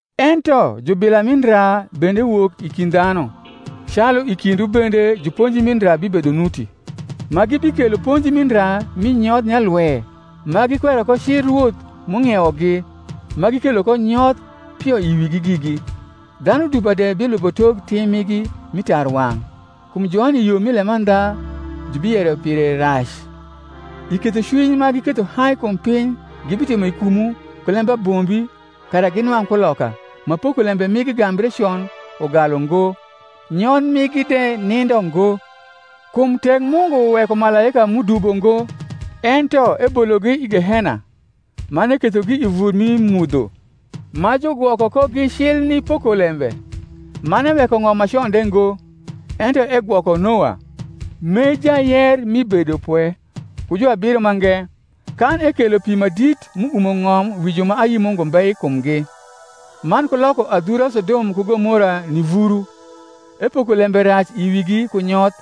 Ento jubila mi ndra bende wok i kind dhanu, calu i kindwu bende juponji mi ndra bibedo nuti, ma gibikelo ponji mi ndra mi nyoth nyalwe, ma gikwero ko cil Rwoth m’ung’iewogi, ma gikelo ko nyoth pio i wigi gigi. Dhanu dupa de bilubo tok tim migi mi tarwang’; kum joni yo mi lemandha jubiyero pire rac. I kethocwiny ma giketho hai kum piny gibitimo i kumwu ku lembabombi kara ginwang’ kuloka: ma pokolembe migi gambre con ugalu ngo, nyoth migi de nindo ngo. Kum tek Mungu weko malaika m’udubo ngo, ento ebologi i gehena, man ekethogi i vur mi mudho, ma jugwoko kogi cil ni pokolembe; man eweko ng’om ma con de ngo, ento egwoko Noa, m’e jayer mi bedopwe ku juabiro mange, kan ekelo pi ma dit m’uumo ng’om wi ju ma ayi Mungu mbe i kumgi; man ku loko adhura Sodom ku Gomora ni vuru, epoko lembe rac i wigi ku nyoth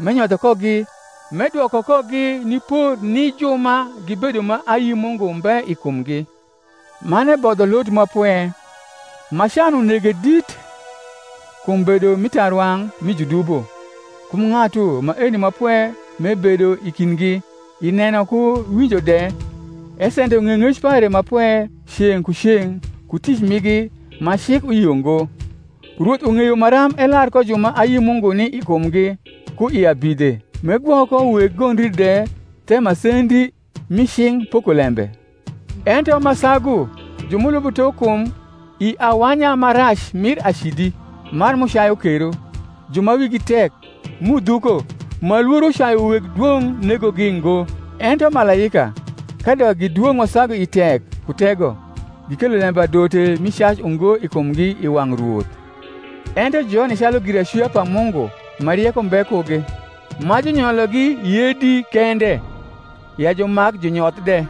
m’enyotho kogi, m’edwoko kogi ni por ni ju ma gibedo ma ayi Mungu mbe i kumgi; man ebodho Lot ma pwe, ma can unege dit kum bedo mi tarwang’ mi judubo (kum ng’atu maeni ma pwe m’ebedo i kindgi, i neno ku winjo de, esendo ng’eyong’ec pare ma pwe ceng’ ku ceng’ ku tic migi ma cik uyio ngo): Rwoth ung’eyo maram elar ko ju ma ayi Mungu ni i kumgi ku i abidhe, m’egwok ko weg gondri de the masendi mi cing’ pokolembe; ento ma sagu ju m’ulubo tok kum i awanya ma rac mir acidi, man m’ucayu kero. Ju ma wigi tek, m’udhuko, ma lworo cayu weg dwong’ negogi ngo: ento malaika, kadok gi dwong’ ma sagu i tek ku tego, gikelo lembadote mi cac ungo i kumgi i wang’ Rwoth. Ento joni calu giracwia pa Mungu ma rieko mbe kugi, ma junyologi yedi kende, ya jumak junyoth de,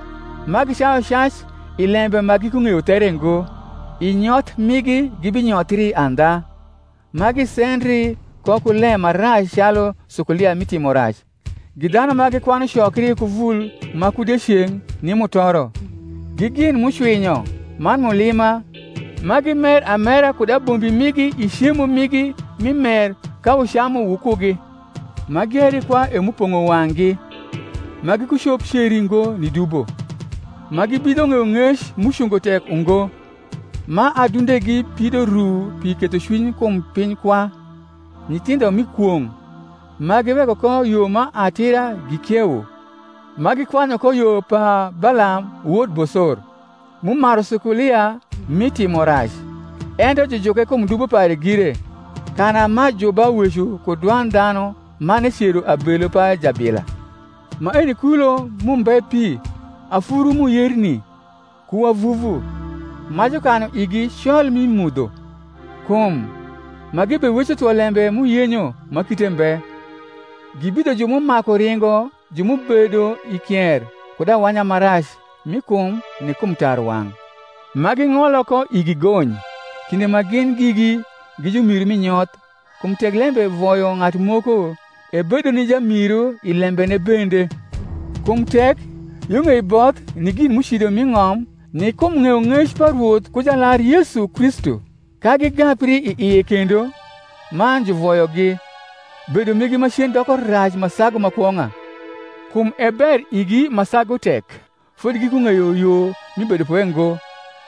ma gicayu cac i lembe ma gikung’eyo there ngo, i nyoth migi gibinyothri andha, ma gisendri ko ku lem ma rac calu sukulia rni timorac; gi dhanu ma gikwanu cokri ku vul ma ku dieceng’ ni mutoro, gi gin m’ucwinyo man mulima, ma gimer amera kud abombi migi i cemo migi mi mer ka wucamu wukugi; ma gieri kwa e m’upong’o wang’gi, ma gikucop ceri ngo ni dubo; ma gibidho ng’eyong’ec m’ucungo tek ungo; ma adundegi pido ru pi kethocwiny kum piny kwa; nyithindho mi kwong’; ma giweko ko yo ma atira gikiewo, ma gikwanyu ko yo pa Balam wod Bosor, m’umaru sukulia mi timorac; ento jujuke kum dubo pare gire: kana m’ajuba weco ku dwand dhanu man ecero abelu pa jabila. Maeni kulo m’umbe pi, afuru m’uyerni ku wavuvu; ma jukanu igi col mi mudho. Kum, ma gibeweco thwo lembe m’uyenyo ma kite mbe, gibidho ju m’umaku ringo ju m’ubedo i kier kud awanya ma rac mi kum ni kum tarwang’; ma ging’olo ko igi gony, kinde ma gin gigi gi jumiru mi nyoth; kum tek lembe voyo ng’atu moko, ebedo ni jamiru i lembene bende. Kum tek, yo ng’ei both ni gin m’ucido m’i ng’om ni kum ng’eyong’ec pa Rwoth ku Jalar Yesu Kristu, ka gigapri i ie kendo man juvoyogi, bedo migi macen doko rac ma sagu ma kwong’a. Kum e ber igi ma sagu tek fodi gikung’eyo yo mi bedopwe ngo,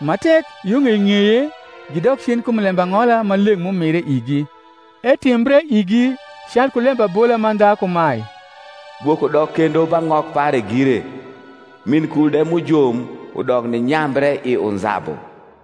ma tek, yo ng’ei ng’eye gidok cen kum lembang’ola ma leng’ m’umire igi. Etimbre igi calku lembabola mandha kumae, Gwok udok kendo ba ng’ok pare gire, min kul de m’ujom udok ninyambre i unzabu.